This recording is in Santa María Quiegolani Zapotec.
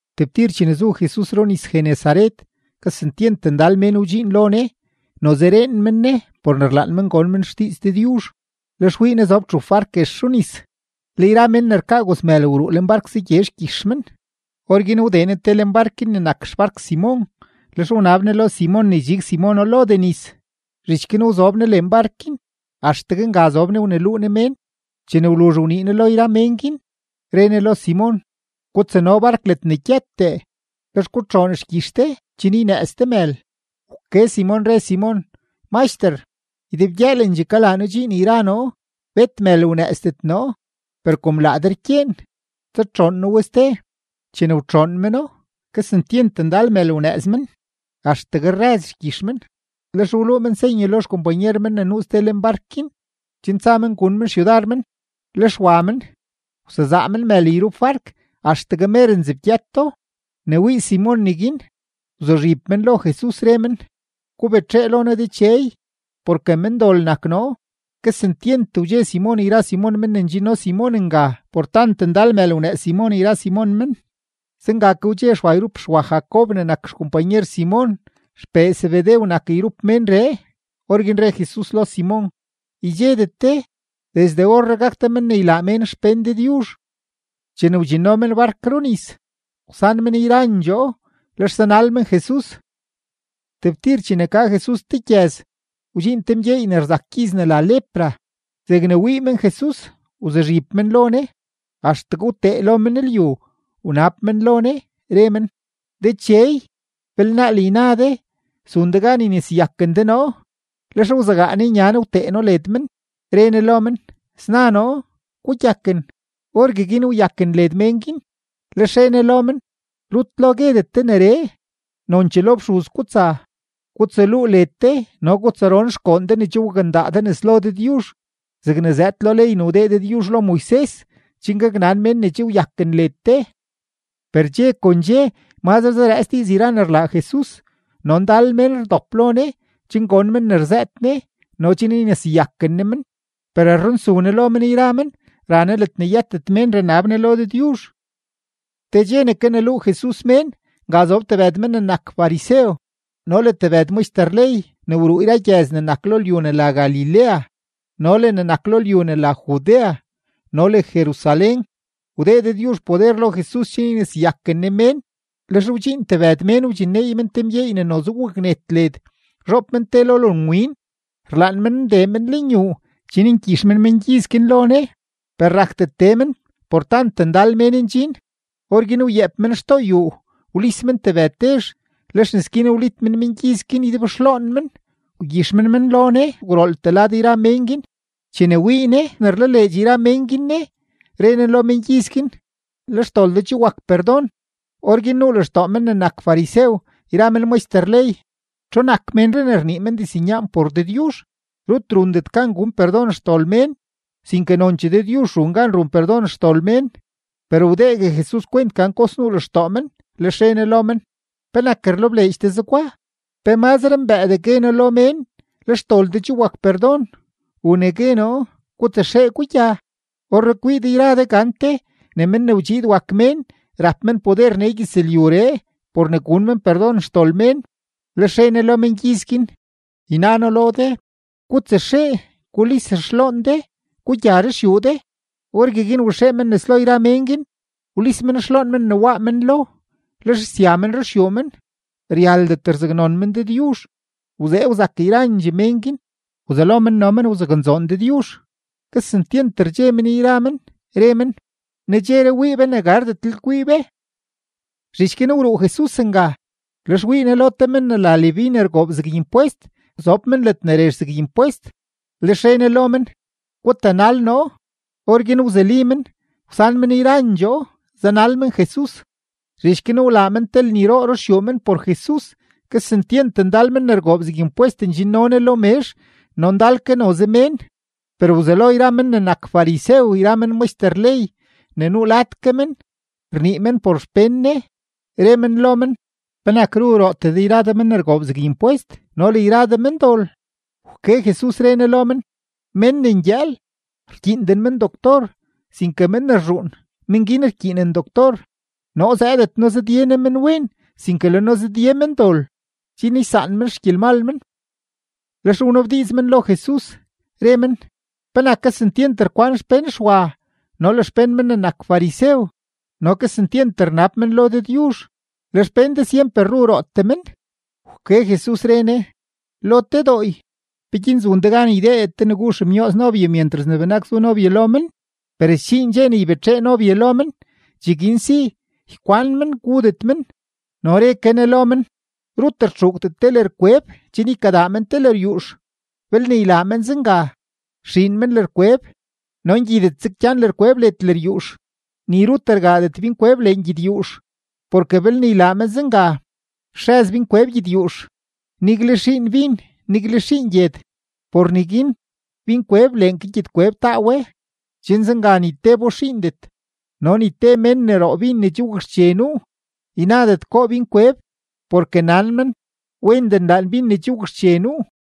Tebtir chene zu Jesus runis-Genesaret, kesentyent ndal mén wdxiin lo Ne. Noze reen men Ne por ne rlaan men gon men xdiiz Dëdyuzh. Lex wii Ne zob txup bark guex runis, le yra men ne rkaa gozmël wruu lenbark zagye xgyix men. Orguin wdee Ne te leen bark guin ne nak xbark Simon, lex wnab Ne lo Simon ne ydxig Simono lodee nis. Zhich guin wzob Ne lenbark guin, axtegue nga zob Ne wneluu Ne mén. Chene wluzh wnii Ne lo yra mén guin, re Ne lo Simon: ―Gutsano bark ledne gyëtdee, lex gutxoon xgyix de chen ynëëz de mël. Wke Simon, re Simon: ―Maxter, ydebgyëëlendxee kalaa noo dxiin yra noo; bet mël wnëëzdet noo. Per kom laa de rkyeen, tsatxoon noo we ste. Chene wtxoon meno, kesentyent ndal mël wnëëz men, axtegue rrëz xgyix men. Lex wluu men senye lo xkompanyer men ne nuu ste lenbark guin, chen tsa men gun men xyudar men. Lex wa men, wsezaa men mël yrup bark axtegue mer nzebgyëto. Ne wii Simon neguin, wzuzhib men lo Jesus, re men: ―Gubetxee lo noo Dechey, porke mendol nak noo. Kesentyent wdxe Simon yra Simon men ne ndxinno Simon nga por tant ndal mël wnëëz Simon yra Simon men. Zenga ke wdxe Xwa yrup Xwa Jacob ne nak xkompanyer Simon; xpee Zebedew nak yrup menree. Orguin re Jesus lo Simon: ―Ydxedet de. Desde orree gak de men ne ylaa mén xpén Dëdyuzh. Chene wdxinno men bark runis, wsan men yrandxoo. Lex zanal men Jesus. Tebtir chene ka Jesus te gyëz, wdxiin te mgyeey ne rzak gyiz ne la lepra; zegne wii men Jesus, wzuzhib men lo Ne axtegue wtee lo men lyu, wnab men lo Ne, re men: ―Dechey, belnaal yna de zun de gan yneseyaken de noo. Lex wzegaa Ne nya Ne wtee No led men, re Ne lo men: ―Sna noo. Gugyaken. Orgueguin wyaken led mén guin. Lex re Ne lo men: ―Rut lo guedet de neree; nonchee lo fxuz gutsa gutsaluu led de no gutsaron xgoon de ne che wakndaa de nes lo Dëdyuzh zegne zëëd lo ley ne wdee Dëdyuzh lo Moises chen gaknan mén ne che wyaken led de. Per dxe kon dxe mazre zarëëts diiz yra ne rlaa Jesus, no ndal mén rdop lo Ne chen gon men ne rzëët Ne no chen yneseyaken Ne men. Per rrunsu Ne lo men yra men, ra Ne ledne yëtet mén ranab Ne lo Dëdyuzh. Te dxe ne kaneluu Jesus mén, nga zob tebëd men ne nak farisew no le tebëd maxter ley ne wruu yra gyëz ne nak lo lyu ne la Galilea no le ne nak lo lyu ne la Judea no le Jerusalén. Wdee Dëdyuzh poder lo Jesus chen yneseyaken Ne mén. Lex wdxiin tebëd mén wdxinneey men te mgyeey ne noze waknet led, zhoob men te lo lonwin. Rlaan men ndee men lenyuu chen ngyix men mengyiz guin lo Ne. Per rakdet tee men por tant ndal mén ndxin. Orguin wyeep men xtoo yuu, wlis men tebëd tezh; lex nes guin wlit men mengyiz guin ydebxloon men, wgyix men men lo Ne gwrooltee lad yra mén guin. Chene wii Ne ne rlaleedx yra mén guin Ne, re Ne lo mengyiz guin: ―Le xdol de che wak perdon. Orguin nuu lextoo men ne nak farisew yra men maxter ley: “¿Txu nak ménree ne rnii men diznyaan por Dëdyuzh? Rut rundet gan gun perdon xdol mén, sinke nonchee Dëdyuzh run gan run perdon xdol mén.” Per wdeegue Jesus kwent gan kox nuu lextoo men, lex re Ne lo men: ―¿Penak rlebleedx de zegwa? ¿Pe mazre mbëëdee gue noo lo mén: “Le xdol de che wak perdon”, u ne gue noo: “Gutsaxee, gugya”? Orree kwii de yra de gante ne Men ne wdxiid wak Mén rap men poder nee gyëzlyuree por ne gun men perdon xdol mén. Lex re Ne lo mengyiz guin: ―Yna noo lo de, gutsaxee gulis xloon de, gugya ruxyuu de. Orgueguin waxee men nes lo yra mén guin, wlis men xloon men ne waa men lo, lex sya men ruxyuu men, ryaldet rzaknon men Dëdyuzh. Wzee wzak yrandxee mén guin, wzelo men no men wzaknzoon Dëdyuzh; kesentyent rdxe men yra men, re men: ―Nedxeree wii be ne gardetlel kwii be. Zhich guin wruu Jesus nga. Lex wii Ne lo te men ne la Leví ne rgoob zeg impwest, zob men ledne rezh zeg impwest, lex re Ne lo men: ―Gutanal noo. Orguin wzuli men; wsan men yrandxoo, zanal men Jesus. Zhich guin wlaa men te lniroo ruxyuu men por Jesus. Kesentyent ndal men ne rgoob zeg impwest ndxinno Ne lo mezh no ndal ke noze mén. Per wzelo yra men ne nak farisew yra men maxter ley ne nuu lad ke men, rnii men por xpén Ne, re men lo men: ―¿Penak ru rootee de yra de men ne rgoob zeg impwest no le yra de mendol? Wke Jesus, re Ne lo men: ―Men ne ngyëël, rkyiinden men doctor, sinke men ne rzhuun, men guin rkyiinen doctor. Noo zëëdet noo zëdye noo menwen, sinke le noo zëdye mendol chen ysaan men xgyelmal men. Lex wnabdiiz men lo Jesus, re men: ―¿Penak kesentyent rkwan xpén Xwa no le xpén men ne nak farisew no kesentyent rnab men lo Dëdyuzh, le xpén de syemper ru rootee men? Wke Jesus, re Ne: ―Lo te dooy, ¿peguin zun de gan ydeedet de ne gu xemyooz nobye myentras ne benak zu nobye lo men? Per sdxiin dxe ne ybetxee nobye lo men; cheguin si ykwan men gudet men. No re ke Ne lo men: ―Rut rtxuugdet te lërkweb chen ykadaa men te lëryuux. Belne ylaa men zenga, sxiin men lërkweb no ngyidetzeg gyan lërkweb led lëryuux. Ni rut rgaadet binkweb lengyedyuux, porke belne ylaa men zenga, stxëz binkweb gyedyuux; nigle xiin bin, nigle xiin gyed. Por neguin binkweb leen ke gyedkweb taa we, chen zenga ni tebo xiindet. No ni te mén ne roo bin ne che wakxche nuu, ynadet goo binkweb, porke nan men: “Wendee nlaan bin ne che wakxche nuu.”